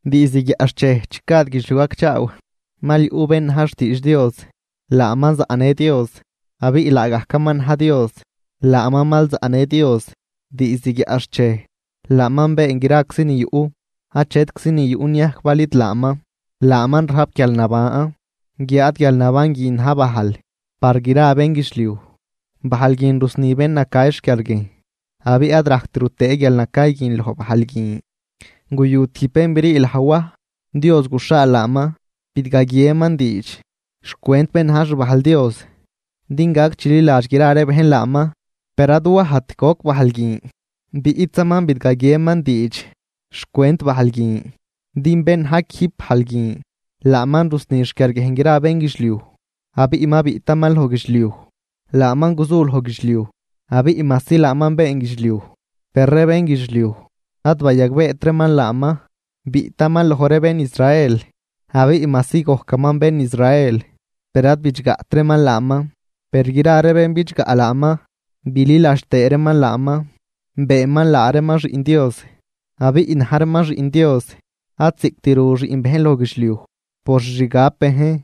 Diizd guiaꞌxchej chi gad guidxliuj gacchaaw, mal yuꞌ bén na̱j xtiidx Dios. Laaman zaꞌnë Dios abiꞌ laagajcaman na̱j Dios. Laaman mal zaꞌnë Dios diizd guiaꞌxchej. Laaman been graczi ni yuꞌ. Achetczi ni yuꞌ niajc bal id laaman. Laaman rajp guialnaban, guiáad guialnaban guin na̱j bajl par gra bénguidxliuj. Bajl guin rusni bén nacay xquiarguiejn, abiꞌ ad rajct rutëë guialnacay guin loj bajl guin. Guyu tijb bén brii laj Waj, Dios guxhaal laaman, bidgaguieman diidx xcwent bén na̱j xbajl Dios, din gac chililadx gra ree bejn laaman. Per ad Wajt goc bajl guin, biꞌtzaman bidgaguieman diidx xcwent bajl guin. Din bén na̱j quijb bajl guin, laaman rusni xquiarguiejn gra bénguidxliuj, abiꞌ ma biꞌtaman loj guidxliuj. Laaman guzu loj guidxliuj, abiꞌ majsi laaman been guidxliuj, per ree bénguidxliuj ad bayagbeet reeman laaman. Biꞌtaman loj ree bén Israel, abiꞌ majsi gojcaman bén Israel, per ad bidxgaꞌt reeman laaman. Per, gra ree bén bidxgaꞌ laaman bililadx tëë reeman laaman, beenman laa reeman xiꞌn Dios. Abiꞌ na̱j reeman xiꞌn Dios, ad ziꞌc rut xiꞌn bejn loj guidxliuj por xixgab bejn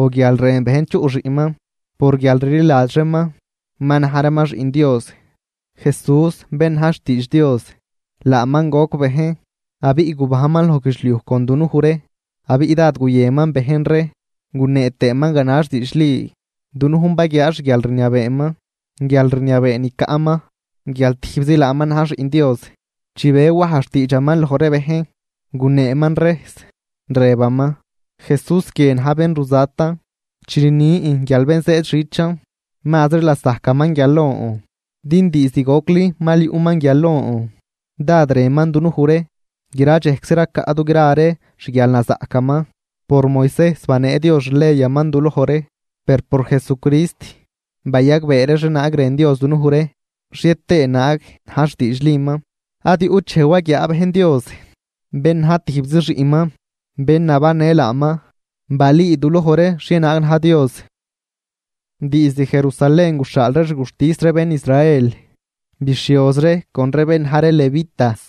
o guial rën bejn chuꞌ xiꞌnman, por guial rliladx reeman ma na̱j reeman xiꞌn Dios. Jesús, bén na̱j xtiidx Dios, laaman goc bejn abiꞌ gubajnman loj guidxliuj con dunuj ree, abiꞌ dád guyënman bejn ree gunee tëëman ganax diidxli. Dunujn baguiaa xguialrniabeeman, guialrniabee ni caꞌman guial tijbzi laaman na̱j Xiꞌn Dios. Chi be Waj xtiidxaman loj ree bejn, guneeman rejs, rëbaman: ―Jesús guie na̱j bén ruzatan, chi rnin guial bén zëëd xichan mazri lasajcaman guial lon, din diizd gocli mal yuꞌman guial lon. Dád rënman dunuj ree, gra dxejczi racaꞌ dugra ree xguialnazaꞌcaman. Por Moisejs banee Dios xleyaman duloj ree, per por Jesucrist bayagbee ree xhienaag rën Dios dunuj ree xhie tëë naag na̱j xtiidxliman. Ad yuꞌt dxej waguiaa bejn Dios. Bén na̱j tijbzi xiꞌnman. Bén nabannë laaman balüü duloj ree xhienaag na̱j Dios. Diizd Jerusalén guxhaal ree xguxtis ree bén Israel bixhioz ree con ree bén na̱j ree levitas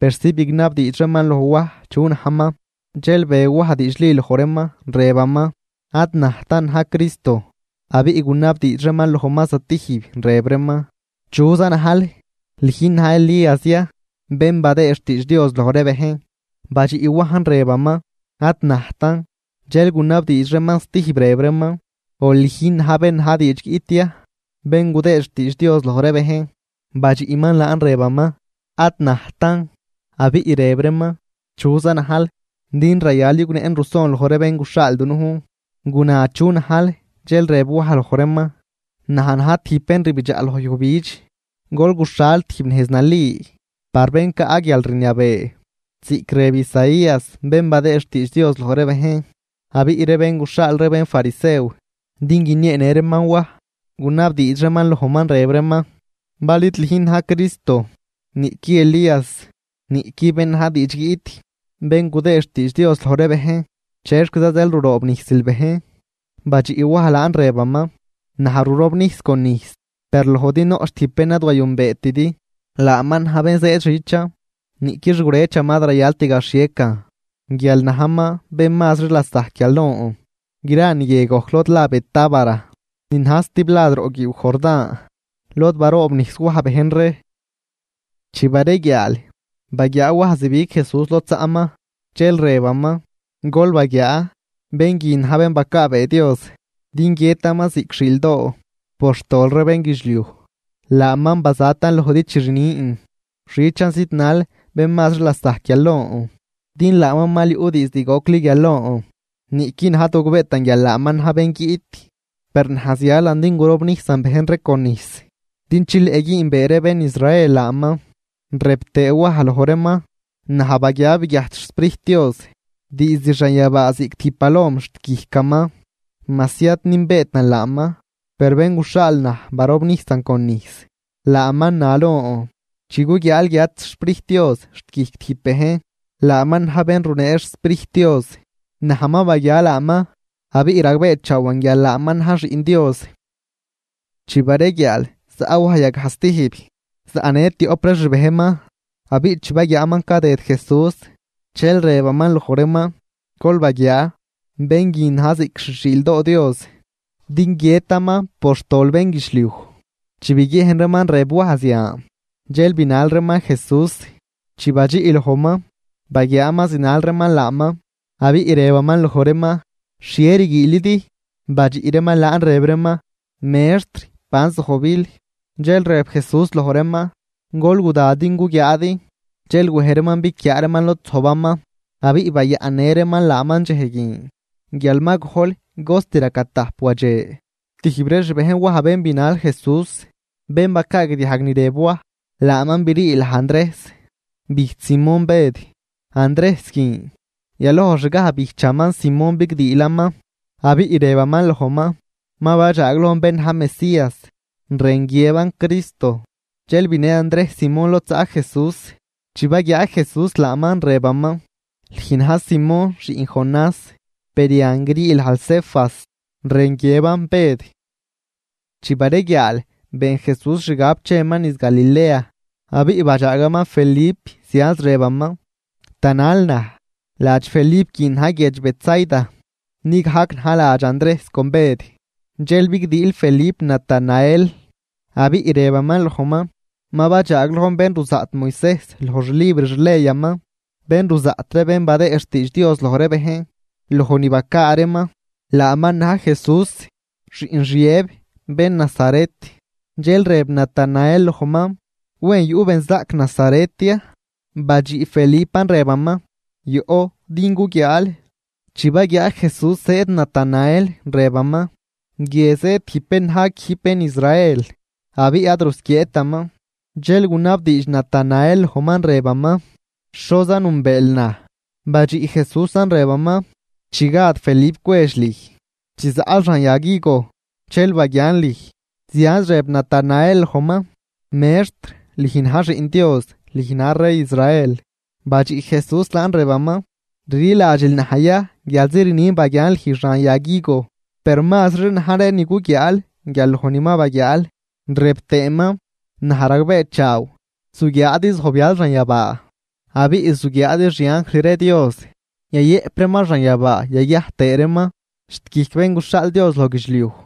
persi bignabdiidx reeman loj Waj chu najman. Dxel be Waj diidxli loj reeman, rëbaman: ―Ad najtan na̱j Cristo. Abiꞌ gunabdiidx reeman lojman stijb rëb reeman: ―¿Chuza najl? ¿Lüjn na̱j Elías ya, bén badëë xtiidx Dios loj ree bejn? Badxiꞌ Wajn rëbaman: ―Ad najtan. Dxel gunabdiidx reeman stijb rëb reeman: ―O, ¿lüjn na̱j bén na̱j diidx guiꞌt ya, bén gudëë xtiidx Dios loj ree bejn? Badxiꞌman laan rëbaman: ―Ad najtan. Abiꞌ rëb reeman: ―¿Chuza najl? Din rayal yugnëꞌn ruson loj ree bén guxhaal dunujn. Guna chu najl. Dxel rëb Waj loj reeman: ―Naj na̱j tijb bén rbidxaꞌ loj yujbidx: “Gol guxhal tijb nejz nali par bén caꞌ guialrniabee” ―ziꞌc rëb Isaías bén badëë xtiidx Dios loj ree bejn. Abiꞌ ree bén guxhaal ree bénfarisew din guinieenë reeman Waj, gunabdiidx reeman lojman, rëb reeman: ―Bal id lüjn na̱j Cristo, niꞌqui Elías, niꞌqui bén na̱j diidx guiꞌt, bén gudëë xtiidx Dios loj ree bejn, ¿chexquiza zeel ruroobnijsil bejn? Badxiꞌ Waj laan rëbaman: ―Naj rurobnijs con nijs, per lojdi noꞌch tijb bén ad wayünbeetidi. Laaman na̱j bén zëëd xichan, niꞌqui xgurëchaman ad rayalt gaxhiecan guial najman bén mazri lasajc guial lon. Gra niguie gojc lod la Betábara, ni na̱j stiblad roꞌ guiiw Jordán, lod baroobnijs Waj bejn ree. Chi bareguiaal, baguiaa Waj zibig Jesús lod zaꞌman, dxel rëbaman: ―Gol baguiaa, bén guin na̱j bén bacaabee Dios din guiëtaman ziꞌc xiildoo por xtol ree bénguidxliuj. Laaman bazatan lojdi chi rnin: “Xichan zidnal bén mazri lasajc guial lon, din laaman mal yuꞌ diizd gocli guial lon.” Niꞌqui naj ad gogbeetan guial laaman na̱j bén guiꞌt, per naj zialan din gurobnijsan bejn ree con nijs din chileꞌ güünbee ree bén Israel laaman. Rëb tëë Waj loj reeman: ―Naj baguia biguiajt xSprijt Dios diizd xanyabaa ziꞌc tijb palom xt guijcaman. Majsi ad nünbeetan laaman, per bén guxhaal naj barobnijsan con nijs, laaman na lon: “Chi guguiaal guiat xSprijt Dios xt guijc tijb bejn, laaman na̱j bén runee xSprijt Dios.” Naj ma baguia laaman, abiꞌ ragbeechaawan guial laaman na̱j Xiꞌn Dios. Chi bareguiaal, zaꞌ Waj yagaj stijb, zaꞌnë tioꞌp ree xbejnman. Abiꞌ chi baguiaaman cadëd Jesús, dxel rëbaman loj reeman: ―Gol baguiaa, bén guinan na̱j ziꞌc xi xiildoo Dios din guiëtaman por xtol bénguidxliuj. Chi biguiejn reeman rëb Waj zian, dxel binal reeman Jesús. Chi badxiꞌ lojman, baguiaaman zinal reeman laaman, abiꞌ rëbaman loj reeman: ―¿Xhie rguiilidi? Badxiꞌ reeman laan rëb reeman: ―Mextr, ¿ban zojbil? Dxel rëb Jesús loj reeman: ―Gol guda din guguiaadi. Dxel wej reeman biquiaa reeman lod zojbaman, abiꞌ bayaꞌnnë reeman laaman dxej guin, guial ma gojl cost raca tajp wadxe. Tijb ree xbejn Waj bén binal Jesús, bén bacaagdiajg ni rëb Waj, laaman brii laj Andrejs, bijch Simón Bëd. Andrejs guin, yalojxgaj bijchaman Simón bigdiilaman, abiꞌ rëbaman lojman: ―Ma badxaaglojn bén na̱j Mesías ―rën guiëban Cristo. Dxel binë Andrejs Simón lod zaꞌ Jesús, chi baguiaa Jesús laaman, rëbaman: ―Lüj na̱j Simón, xiꞌn Jonás, per yan grii lajl Cefas ―rën guiëban Bëd. Chi bareguiaal been Jesús xgab cheman niz Galilea, abiꞌ badxaagaman Felip, zianz rëbaman: ―Tanal naj. Ladx Felip guin na̱j guiedx Betsaida, ni gajc na̱j ladx Andrejs con Bëd. Dxel bigdiil Felip Natanael, abiꞌ rëbaman lojman: ―Ma badxaaglojn bén ruzaꞌt Moisejs loj xlibr xleyaman, bén ruzaꞌt ree bén badëë xtiidx Dios loj ree bejn loj ni bacaa reeman. Laaman na̱j Jesús, xiꞌn Xiëb, bén Nazaret. Dxel rëb Natanael lojman: ―¿Wen yuꞌ benzaꞌc Nazaret ya? Badxiꞌ Felipan rëbaman: ―Yoꞌ din guguiaal. Chi baguiaa Jesús zëëd Natanael, rëbaman: ―Guie zëëd tijb bén na̱j quijb bén Israel, abiꞌ ad rusquieetaman. Dxel gunabdiidx Natanael lojman, rëbaman: ―¿Xoza nünbeel naj? Badxiꞌ Jesúsan rëbaman: ―Chi gad Felip cwedx lüj, chi zaꞌl xan yag higo, dxel baguian lüj. Zianz rëb Natanael lojman: ―Mextr, lüj na̱j Xiꞌn Dios, lüj na̱j rey Israel. Badxiꞌ Jesús laan rëbaman: ―¿Rliladxil naj ya guialzi rnin baguian lüj xan yag higo? Per mazri na̱j ree ni guguiaal guial loj ni ma baguiaal. Rëb tëëman: ―Naj ragbeechaaw, zuguiaadi zojbyal xanyabaa, abiꞌ zuguiaadi xianjl ree Dios yayëꞌp reeman xanyabaa yaguiajt tëë reeman xt guijc Bén guxhaal Dios loj guidxliuj.